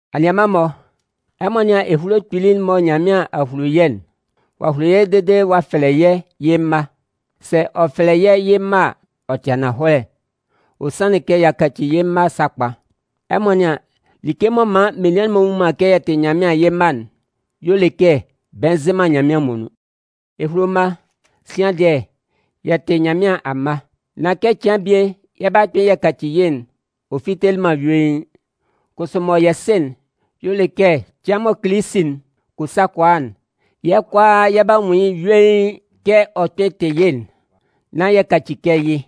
Anianman-mɔ, ɛmɔ nɩ́an ehulo kpili'n mɔ Nyanmɩan a hulo yɛ́'n! Ɔ'a hulo yɛ́ dede ɔ'a fɛlɛ yɛ́ yɩ́ mma. Sɛ ɔ fɛlɛ yɛ́ yɩ́ mma a, ɔ tɩ ananhɔlɛ, ɔ sanlɩn kɛ y'a kaci yɩ́ mma sakpa. Ɛmɔ nɩ́an, like m'ɔ man menian'n-mɔ nnwun man kɛ yɛ tɩ yɩ́ mma'n, y'ɔ le kɛ bɛ nzɩ man Nyanmɩan muonun. Ehulo mma, sian dɩɛ, yɛ tɩ Nyanmɩan amma. Nán kɛ cɩan bie yɛ 'ba kpɩn yɛ kaci yɩ́'n, ɔ fitelɩ man yuein. Kʋsʋ mɔ yɛ sɩ'n y'ɔ le kɛ cɩan mɔ Kilisi'n kɔ sa kɔ a'n, yɛ́ kʋalaa yɛ 'ba nwun yɩ́ yuein kɛ ɔ kpɩn tɩ yɩ́'n, nán yɛ kaci kɛ yɩ́.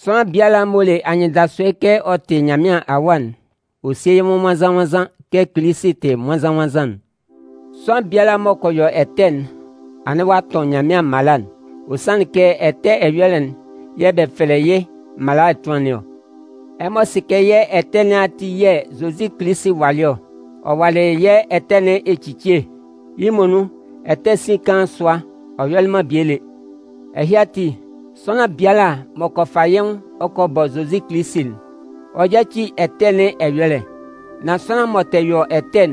Sʋanlan biala m'ɔ le anyɩndasʋɛ kɛ ɔ tɩ Nyanmɩan awa'n, ɔ sie yɩ́ nwʋn nwannzan-nwannzan kɛ Kilisi tɩ nwannzan-nwannzan'n. Sʋanlan biala m'ɔ kɔ yɔ ɛtɛ'n, anɩn ɔ'a tʋn Nyanmɩan mala'n. Ɔ sanlɩn kɛ ɛtɛ ɛyɔlɛ'n yɛ̂ bɛ fɛlɛ yɩ́ mala ɛtʋan nɩn ɔ. Ɛmɔ sɩ kɛ yɛ́ ɛtɛ nɩn ati yɛ̂ Zozi Kilisi walɩ ɔ. Ɔ walɩ yɛ́ ɛtɛ nɩn ecicie. Yɩ́ muonun, ɛtɛ sin kaan sʋa, ɔ yɔlɩ man bie lé. Ɛhɩ ati, sʋanlan biala m'ɔ kɔ fa yɩ́ nwʋn ɔ kɔ bɔ Zozi Kilisi'n, ɔ yáci ɛtɛ nɩn ɛyɔlɛ. Nan sʋanlan m'ɔ tɛ yɔ ɛtɛ'n,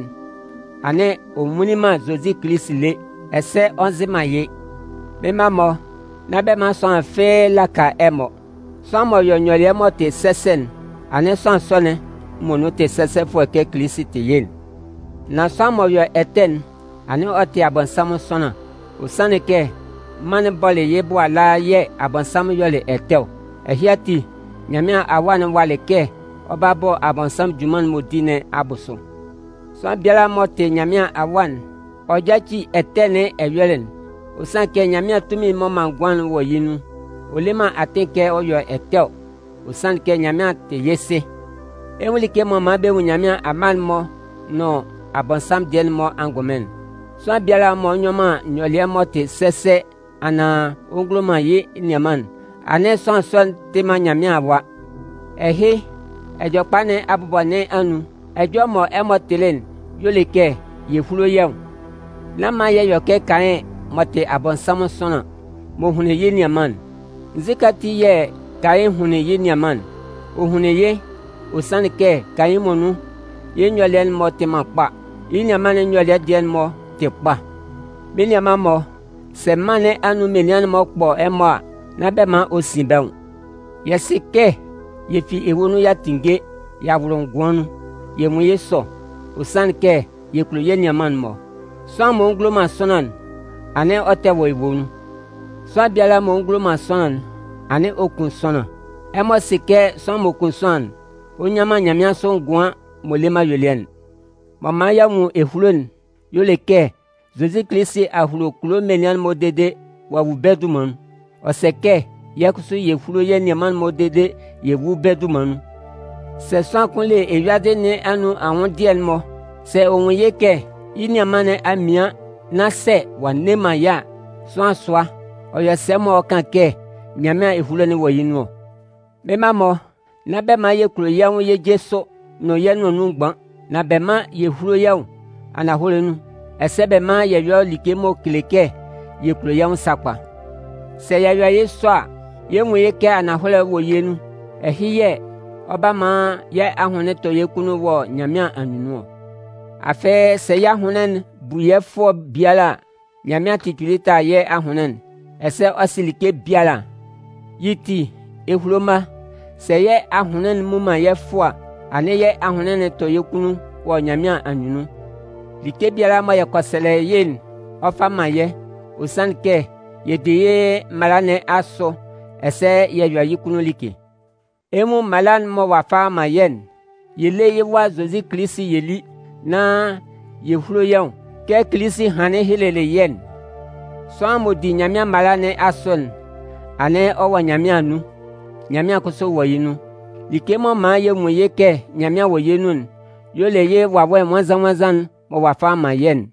anɩn ɔ nwunlin man Zozi Kilisi lé ɛsɛ ɔ nzɩ man yɩ́. Mɩ́n mma-mɔ, nán bɛ man sʋanlan fɩ́ɩ́ laka ɛmɔ. Sʋanlan m'ɔ yɔ nyɔlɩɛ m'ɔ tɩ sɛsɛ'n, anɩn sʋanlan sɔ'n muonun tɩ sɛsɛfʋɛ kɛ Kilisi tɩ yɩ́'n. Nan sʋanlan m'ɔ yɔ ɛtɛ'n, anɩn ɔ tɩ Abɔnsanmʋn sʋanlan. Ɔ sanlɩn kɛ mân'n bɔlɩ yɩ́ bʋ ala yɛ̂ Abɔnsanmʋn yɔlɩ ɛtɛ ɔ. Ɛhɩ ati, Nyanmɩan Awa'n walɩ kɛ ɔ 'ba bɔ Abɔnsanmʋn junman'n m'ɔ di nɩn abʋsʋ. Sʋanlan biala m'ɔ tɩ Nyanmɩan awa'n, ɔ yáci ɛtɛ nɩn ɛyɔlɛ. Ɔ sanlɩn kɛ Nyanmɩan tunmin'n m'ɔ man ngʋan'n wɔ yɩ́ nun. Ɔ le man atɩn kɛ ɔ yɔ ɛtɛ ɔ, ɔ sanlɩn kɛ Nyanmɩan tɩ yɩ́ Sɩ. Ɛ 'nwun like m'ɔ man bɛ nwun Nyanmɩan amma'n-mɔ nʋn Abɔnsanmʋn dɩɛ'n-mɔ angʋnmɩn'n: sʋanlan biala m'ɔ nyɔ man nyɔlɩɛ m'ɔ tɩ sɛsɛ anaan ɔ ngulo man yɩ́ nianman'n, anɩn sʋanlan sɔ'n tɩ man Nyanmɩan awa. Ɛhɩ, Ɛjɔlɛkpa nɩn abʋbɔ nɩn anun, ɛjɔlɛ mɔ ɛmɔ tɩlɩ'n y'ɔ le kɛ yɛ húlo yɛ́ nwʋn. Nán man yɛ yɔ kɛ Kayɩn m'ɔ tɩ Abɔnsanmʋn sʋanlan, m'ɔ hunlin yɩ́ nianman'n. Nzukɛ ati yɛ̂ Kayɩn hunlin yɩ́ nianman'n? Ɔ hunlin yɩ́, ɔ sanlɩn kɛ Kayɩn muonun, yɩ́ nyɔlɩɛ'n-mɔ tɩ man kpa. Yɩ́ nianman'n nyɔlɩɛ dɩɛ'n-mɔ tɩ kpa. Mɩ́n nianman-mɔ, sɛ mân nɩn anun menian'n-mɔ kpɔ ɛmɔ a, nán bɛ man ɔ sin bɛ́ nwʋn. Yɛ sɩ kɛ yɛ fi ewue nun y'a tinnge y'a wʋlʋ ngʋan nun. Yɛ nwun yɩ́ sɔ, ɔ sanlɩn kɛ yɛ kulo yɛ́ nianman'n-mɔ. Sʋanlan m'ɔ ngulo man sʋanlan'n, anɩn ɔ tɛ wɔ ewue nun. Sʋanlan biala m'ɔ ngulo man sʋanlan'n, anɩn ɔ kun sʋanlan. Ɛmɔ sɩ kɛ sʋanlan m'ɔ kun sʋanlan'n, ɔ nnyan man nyanmɩansʋ ngʋan'n m'ɔ le man ayuelɩɛ'n. M'ɔ man y'a nwun ehulo'n y'ɔ le kɛ Zozi Kilisi a hulo kulo menian'n-mɔ dede ɔ'a wu bɛ́ dunman nun. Ɔ sɛ kɛ yɛ́ kʋsʋ yɛ húlo yɛ́ nianman'n-mɔ dede yɛ wú bɛ́ dunman nun. Sɛ sʋanlan kʋn le eyuadɩ nɩn anun anwʋndɩɛ'n-mɔ, sɛ ɔ nwun yɩ́ kɛ yɩ́ nianman nɩn a mian nán sɛ ɔ'a nne man yɩ́ a, sʋanlan sʋa, ɔ yɔ sɛ m'ɔ kan kɛ Nyanmɩan ehulo'n wɔ yɩ́ nun ɔ? Mɩ́n mma-mɔ, nán bɛ man yɛ kulo yɛ́ nwʋn yɛ́ je sʋ nʋn yɛ́ nʋan nun mgban. Nan bɛ mán yɛ húlo yɛ́ nwʋn ananhɔlɛ nun, ɛsɛ bɛ mán yɛ yɔ́ like m'ɔ kele kɛ yɛ kulo yɛ́ nwʋn sakpa. Sɛ yɛ yɔ yɩ́ sɔ a, yɛ 'nwun yɩ́ kɛ ananhɔlɛ'n wɔ yɛ́ nun. Ɛhɩ yɛ̂ ɔ 'ba man yɛ́ ahʋnlɩn 'tɔ yɛ́ kunnun wɔ Nyanmɩan anyunnun ɔ. Afɩ, sɛ yɛ́ ahʋnlɩn'n bu yɛ́ fʋɔ biala a, Nyanmɩan tɩ kpili tala yɛ́ ahʋnlɩn'n, ɛsɛ ɔ sɩ like biala. Yɩ́ ti, ehulo mma, sɛ yɛ́ ahʋnlɩn'n mmu man yɛ́ fʋɔ a, anɩn yɛ́ ahʋnlɩn tɔ yɛ́ kunnun wɔ Nyanmɩan anyunnun. Like biala mɔ yɛ kɔ sɛlɛ yɩ́'n, ɔ 'fa man yɛ́. Ɔ sanlɩn kɛ yɛ di yɩ́ mala nɩn asʋ ɛsɛ yɛ yɔ yɩ́ kunnun like. Ɛ 'nwun mala'n mɔ ɔ'a fa ɔ'a man yɛ́'n: Yɛ lé yɩ́ Wa Zozi Kilisi yɛ lí, nán yɛ húlo yɛ́ nwʋn kɛ Kilisi hanlɩn helelɩ yɛ́'n. Sʋanlan m'ɔ di Nyanmɩan mala nɩn asʋ'n, anɩn ɔ wɔ Nyanmɩan anun, Nyanmɩan kʋsʋ wɔ yɩ́ nun. Like m'ɔ man yɛ nwun yɩ́ kɛ Nyanmɩan wɔ yɛ́ nun'n y'ɔ le yɩ́ Wawɛ Nwannzan-nwannzan'n mɔ ɔ'a fa ɔ'a man yɛ́'n.